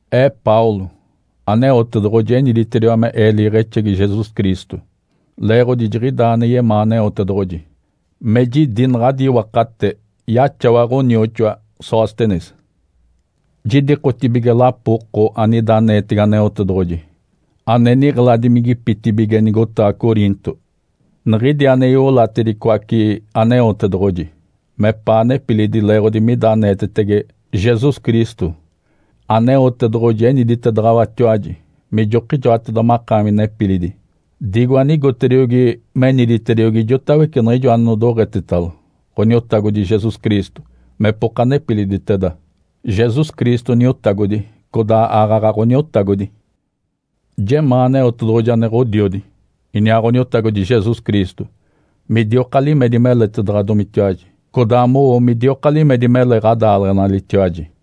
Ee Paulo, Aneotedoɡ̶oji eniditediwa me ee liiɡ̶exegi Jesus Cristo, leeɡ̶odi jiɡ̶idaa ane yemaa Aneotedoɡ̶oji. Me jidi naɡ̶adi iwakate yaxawa ɡ̶onioxoa Sóstenes. Jidikotibige lapo oko anida aneetege Aneotedoɡ̶oji, ane niɡ̶eladimigipitibige nigotaɡ̶a Coriinto, niɡ̶idi ane iolatedicoace Aneotedoɡ̶oji mepaa nepilidi leeɡ̶odi mida aneetetege Jesus Cristo. Aneotedoɡ̶oji eniditedaɡ̶awatiwaji mijokijoateda makaami nepilidi, digo anigotediogi meniditediogi ijotawece niɡ̶ijo anodoɡ̶etetalo Ǥoniotagodi Jesus Cristo mepoka nepiliditeda. Jesus Cristo Niotagodi, codaa aaɡ̶aɡ̶a Ǥoniotagodi. Jemaa Aneotedoɡ̶oji ane Ǥodiodi, iniaa Ǥoniotagodi Jesus Cristo midioka limedi meletaɡ̶adomitiwaji, codaa mowo midioka limedi mele ɡ̶adaaleɡ̶enalitiwaji.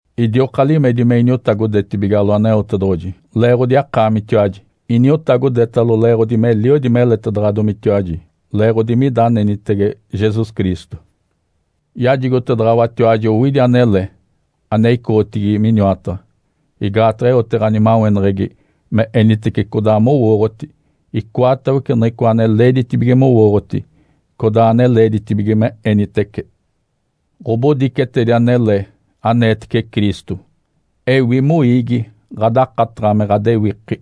Idioka limedi me iniotagodetibigalo Aneotedoɡ̶oji leeɡ̶odi akaamitiwaji, iniotagodetalo leeɡ̶odi meliodi meletedaɡ̶adomitiwaji leeɡ̶odi mida anenitege Jesus Cristo. Yajigotedaɡ̶awatiwaji owidi anele ane icoɡ̶otigi miniwataɡ̶a, igaataɡ̶a eote ɡ̶animaweneɡ̶egi me enitece codaa mowooɡ̶oti, icoatawece niɡ̶icoa ane leeditibige mowooɡ̶oti codaa ane leeditibige me enitece. Ǥobodicetedi anele aneetece Cristo ewi moiigi ɡ̶adakataɡ̶a me ɡ̶adewiki.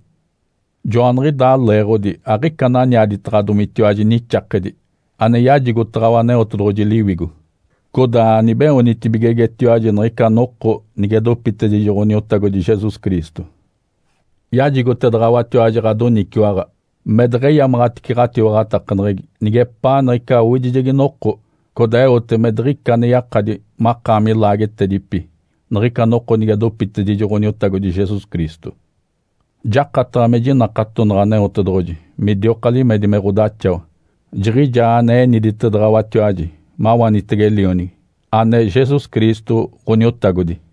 Joaniɡ̶idaa leeɡ̶odi aɡ̶ica ananiaditaɡ̶adomitiwaji nixakedi ane yajigotaɡ̶awa Aneotedoɡ̶oji Liwigo. Codaa anibeoonitibigegetiwaji niɡ̶ica noko nige dopitedijo Ǥoniotagodi Jesus Cristo. Yajigotedaɡ̶awatiwaji ɡ̶adoniciwaɡ̶a me deɡ̶eyamaɡ̶atice ɡ̶atiwaɡ̶atakaneɡ̶egi nigepaa niɡ̶ica owidijegi noko, codaa eote me diɡ̶ica ane yakadi makaami laagetedipi niɡ̶ica noko nige dopitedijo Ǥoniotagodi Jesus Cristo. Jakataɡ̶a me jinakatonaɡ̶a Aneotedoɡ̶oji midioka limedi me ɡ̶odaxawa. Jiɡ̶ijaa ane eniditedaɡ̶awatiwaji mawanitege Lionigi, ane Jesus Cristo, Ǥoniotagodi.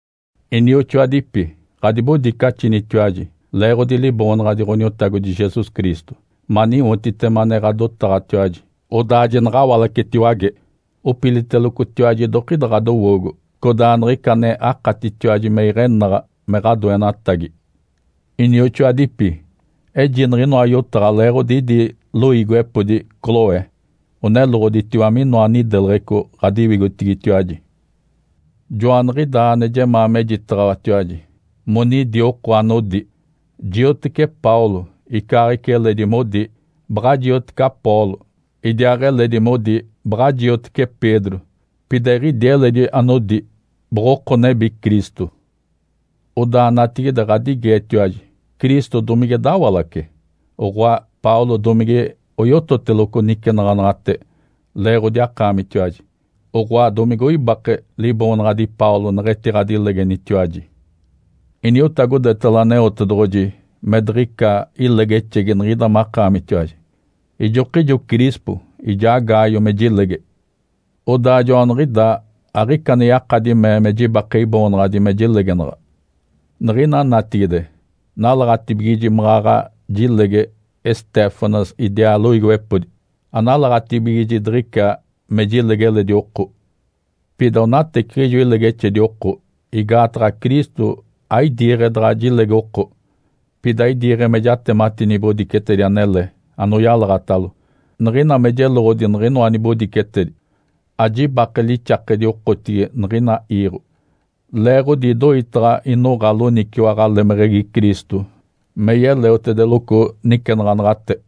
Inioxoadipi, ɡ̶adibodicaxinitiwaji leeɡ̶odi Liboonaɡ̶adi Ǥoniotagodi Jesus Cristo maniwotitema ane ɡ̶adotaɡ̶atiwaji, odaa jinaɡ̶awalacetiwage. Opilitelocotiwaji idokida ɡ̶adowoogo, codaa niɡ̶ica ane akatitiwaji me iɡ̶enaɡ̶a me ɡ̶adoenatagi. Inioxoadipi, eji niɡ̶inoa yotaɡ̶a leeɡ̶odi idi loiigiwepodi Cloe oneloɡ̶oditiwa minoa nideleɡ̶eco ɡ̶adiwigotigitiwaji. Joaniɡ̶idaa ane jemaa mejitaɡ̶awatiwaji monidi oko anodi, “Jioteci Paulo”, icaaɡ̶ica eledi modi, “Baɡ̶a jioteci Apolo”, idiaaɡ̶eledi modi, “Baɡ̶a jioteci Pedro”, pida eɡ̶idi eledi anodi, “Boɡ̶oko nebi Cristo”. Odaa natigide ɡ̶adigeetiwaji, Cristo domige dawalace? Oɡ̶oa, Paulo domige oyototeloco nicenaɡ̶anaɡ̶ate leeɡ̶odi akaamitiwaji? Oɡ̶oa, domige oibake liboonaɡ̶adi Paulo neɡ̶etiɡ̶adilegenitiwaji? Iniotagodetalo Aneotedoɡ̶oji me diɡ̶ica ilegexegi niɡ̶ida makaamitiwaji, ijokijo Crispo ijaa Gaio me jilege. Odaa joaniɡ̶idaa aɡ̶ica ane yakadi mee me jibake iboonaɡ̶adi me jilegenaɡ̶a. Niɡ̶ina natigide nalaɡ̶atibigiji maɡ̶aɡ̶a jilege Estéfanas idiaa loiigiwepodi. Analaɡ̶atibigiji diɡ̶ica me jilege eledi oko. Pida onateciɡ̶ijo ilegexedi oko, igaataɡ̶a Cristo aidiiɡ̶e daɡ̶a jilege oko, pida idiiɡ̶e me jatemati nibodicetedi anele anoyalaɡ̶atalo. Niɡ̶ina me jeloɡ̶odi niɡ̶inoa nibodicetedi, ajibake lixakedi okotigi niɡ̶ina iiɡ̶o, leeɡ̶odi idoitaɡ̶a inoɡ̶a loniciwaɡ̶a lemeɡ̶egi Cristo me yeleotedeloco nicenaɡ̶anaɡ̶ate.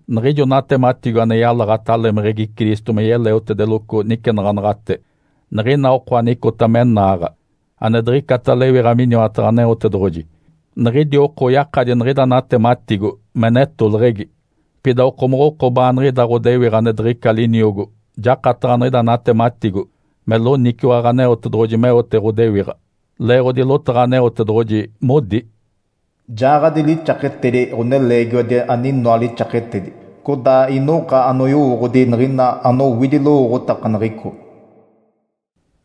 Niɡ̶ijo natematigo ane yalaɡ̶ata lemeɡ̶egi Cristo me yeleotedeloco nicenaɡ̶anaɡ̶ate, niɡ̶ina oko anicota me naaɡ̶a, ane diɡ̶icata lewiɡ̶a miniwataɡ̶a Aneotedoɡ̶oji, niɡ̶idi oko oyakadi niɡ̶ida natematigo me netoleɡ̶egi. Pida okomoɡ̶oko baaniɡ̶ida ɡ̶odewiɡ̶a ane diɡ̶ica liniogo jakataɡ̶a niɡ̶ida natematigo me loniciwaɡ̶a Aneotedoɡ̶oji meote ɡ̶odewiɡ̶a. Leeɡ̶odi lotaɡ̶a Aneotedoɡ̶oji modi, “Jaaɡ̶adi lixaketedi ɡ̶oneleegiwadi aninoa lixaketedi, codaa inoɡ̶a anoyowooɡ̶odi niɡ̶ina anowidi lowooɡ̶otakaneɡ̶eco.”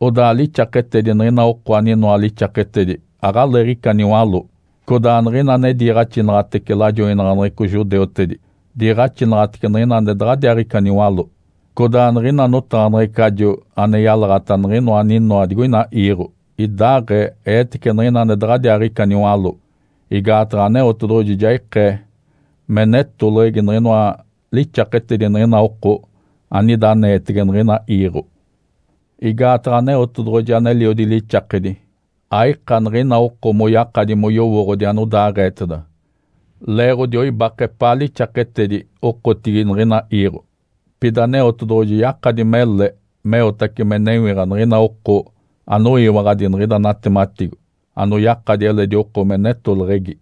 Odaa lixakedi niɡ̶ina oko aninoa lixaketedi aɡ̶aleeɡ̶ica niwaló. Codaa niɡ̶ina ane diiɡ̶axinaɡ̶atece lajoinaɡ̶aneɡ̶eco judeutedi diiɡ̶axinaɡ̶atece niɡ̶ina ane daɡ̶adiaaɡ̶ica niwaló. Codaa niɡ̶ina notaɡ̶aneɡ̶ecajo ane yalaɡ̶ata niɡ̶inoa aninoa digoina iiɡ̶o idaaɡ̶ee eetece niɡ̶ina ane daɡ̶adiaaɡ̶ica niwaló. Igaataɡ̶a Aneotedoɡ̶oji ja ikee me netoleɡ̶egi niɡ̶inoa lixaketedi niɡ̶ina oko anida aneetege niɡ̶ina iiɡ̶o. Igaataɡ̶a Aneotedoɡ̶oji aneliodi lixakedi, aika niɡ̶ina oko moyakadi moyowooɡ̶odi anodaaɡ̶eeteda, leeɡ̶odi oibake epaa lixaketedi okotigi niɡ̶ina iiɡ̶o. Pida Aneotedoɡ̶oji yakadi mele meotace me newiɡ̶a niɡ̶ina oko anoyiwaɡ̶adi niɡ̶ida natematigo anoyakadi eledi oko me netoleɡ̶egi.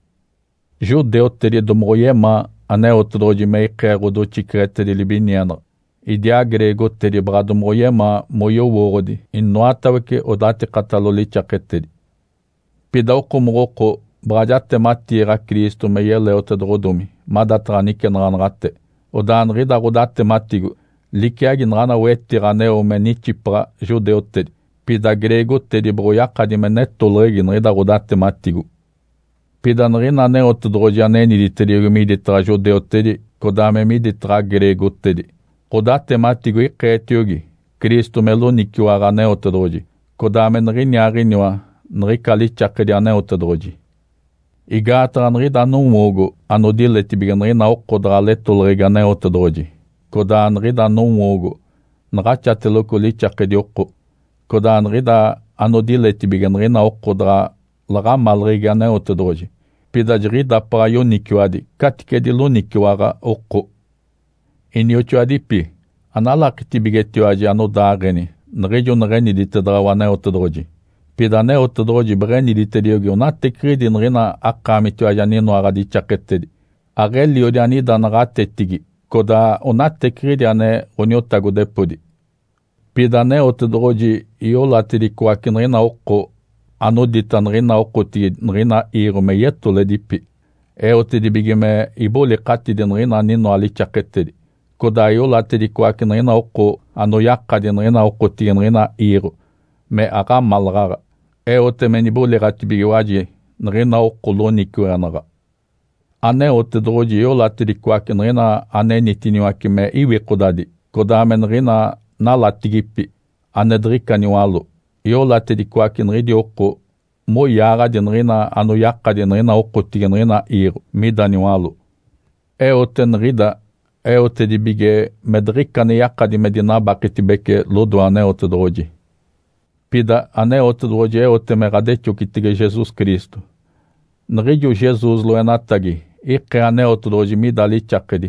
Judeutedi domoɡ̶oyemaa Aneotedoɡ̶oji me ikee ɡ̶odoxiceɡ̶etedi libinienaɡ̶a, idiaa greegotedi baɡ̶a domoɡ̶oyemaa moyowooɡ̶odi inoatawece odatikatalo lixaketedi. Pida okomoɡ̶oko baɡ̶a jatematiiɡ̶a Cristo me yeleotedoɡ̶odomi madataɡ̶a nicenaɡ̶anaɡ̶ate. Odaa niɡ̶ida ɡ̶odatematigo liciagi naɡ̶ana wetiɡ̶a aneo me nixipaɡ̶a judeutedi, pida greegotedi boɡ̶oyakadi me netoleɡ̶egi niɡ̶ida ɡ̶odatematigo. Pida niɡ̶ina Aneotedoɡ̶oji ane eniditediogi miditaɡ̶a judeutedi, codaa me miditaɡ̶a greegotedi, ɡ̶odatematigo ikeetiogi Cristo me loniciwaɡ̶a Aneotedoɡ̶oji codaa me niɡ̶iniaaɡ̶iniwa niɡ̶ica lixakedi Aneotedoɡ̶oji. Igaataɡ̶a niɡ̶ida nowoogo anodiletibige niɡ̶ina oko daɡ̶a letoleɡ̶egi Aneotedoɡ̶oji, codaa niɡ̶ida nowoogo naɡ̶axateloco lixakedi oko. Codaa niɡ̶ida anodiletibige niɡ̶ina oko daɡ̶a laɡ̶amaleɡ̶egi Aneotedoɡ̶oji, pida jiɡ̶idapaɡ̶a yoniciwadi caticedi loniciwaɡ̶a oko. Inioxoadipi, analakitibigetiwaji anodaaɡ̶eni niɡ̶ijo neɡ̶eniditedaɡ̶awa Aneotedoɡ̶oji! Pida Aneotedoɡ̶oji beɡ̶eniditediogi onateciɡ̶idi niɡ̶ina akaamitiwaji aninoa ɡ̶adixaketedi, aɡ̶eliodi anida naɡ̶atetigi, codaa onateciɡ̶idi ane ɡ̶oniotagodepodi. Pida Aneotedoɡ̶oji iolatedicoace niɡ̶ina oko, anodita niɡ̶ina okotigi niɡ̶ina iiɡ̶o me yetoledipi. Eotedibige me ibolikatidi niɡ̶ina aninoa lixaketedi. Codaa iolatedicoace niɡ̶ina oko anoyakadi niɡ̶ina okotigi niɡ̶ina iiɡ̶o me aɡ̶amalaɡ̶aɡ̶a, eote me niboliɡ̶atibigiwaji niɡ̶ina oko loniciweɡ̶enaɡ̶a. Aneotedoɡ̶oji iolatedicoace niɡ̶ina anenitiniwace me iwikodadi, codaa me niɡ̶ina nalatigipi, ane diɡ̶ica niwaló. Iolatedicoace niɡ̶idi oko moyaaɡ̶adi niɡ̶ina anoyakadi niɡ̶ina okotigi niɡ̶ina iiɡ̶o mida niwaló. Eote niɡ̶ida eotedibige me diɡ̶ica ane yakadi me dinabaketibece lodoe Aneotedoɡ̶oji. Pida Aneotedoɡ̶oji eote me ɡ̶adexocitege Jesus Cristo. Niɡ̶ijo Jesus loenatagi ikee Aneotedoɡ̶oji mida lixakedi,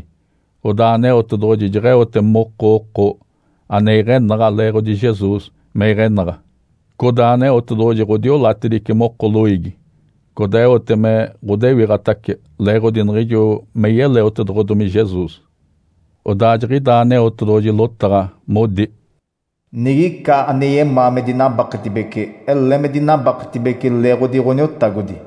odaa Aneotedoɡ̶oji jeɡ̶eote moko oko ane iɡ̶enaɡ̶a leeɡ̶odi Jesus me iɡ̶enaɡ̶a. Codaa Aneotedoɡ̶oji ɡ̶odiolatedice moko loiigi, codaa eote me ɡ̶odewiɡ̶atace leeɡ̶odi niɡ̶ijo me yeleotedoɡ̶odomi Jesus. Odaa jiɡ̶idaa Aneotedoɡ̶oji lotaɡ̶a modi, “Nigica ane yemaa me dinabaketibece, ele me dinabaketibece leeɡ̶odi Ǥoniotagodi!”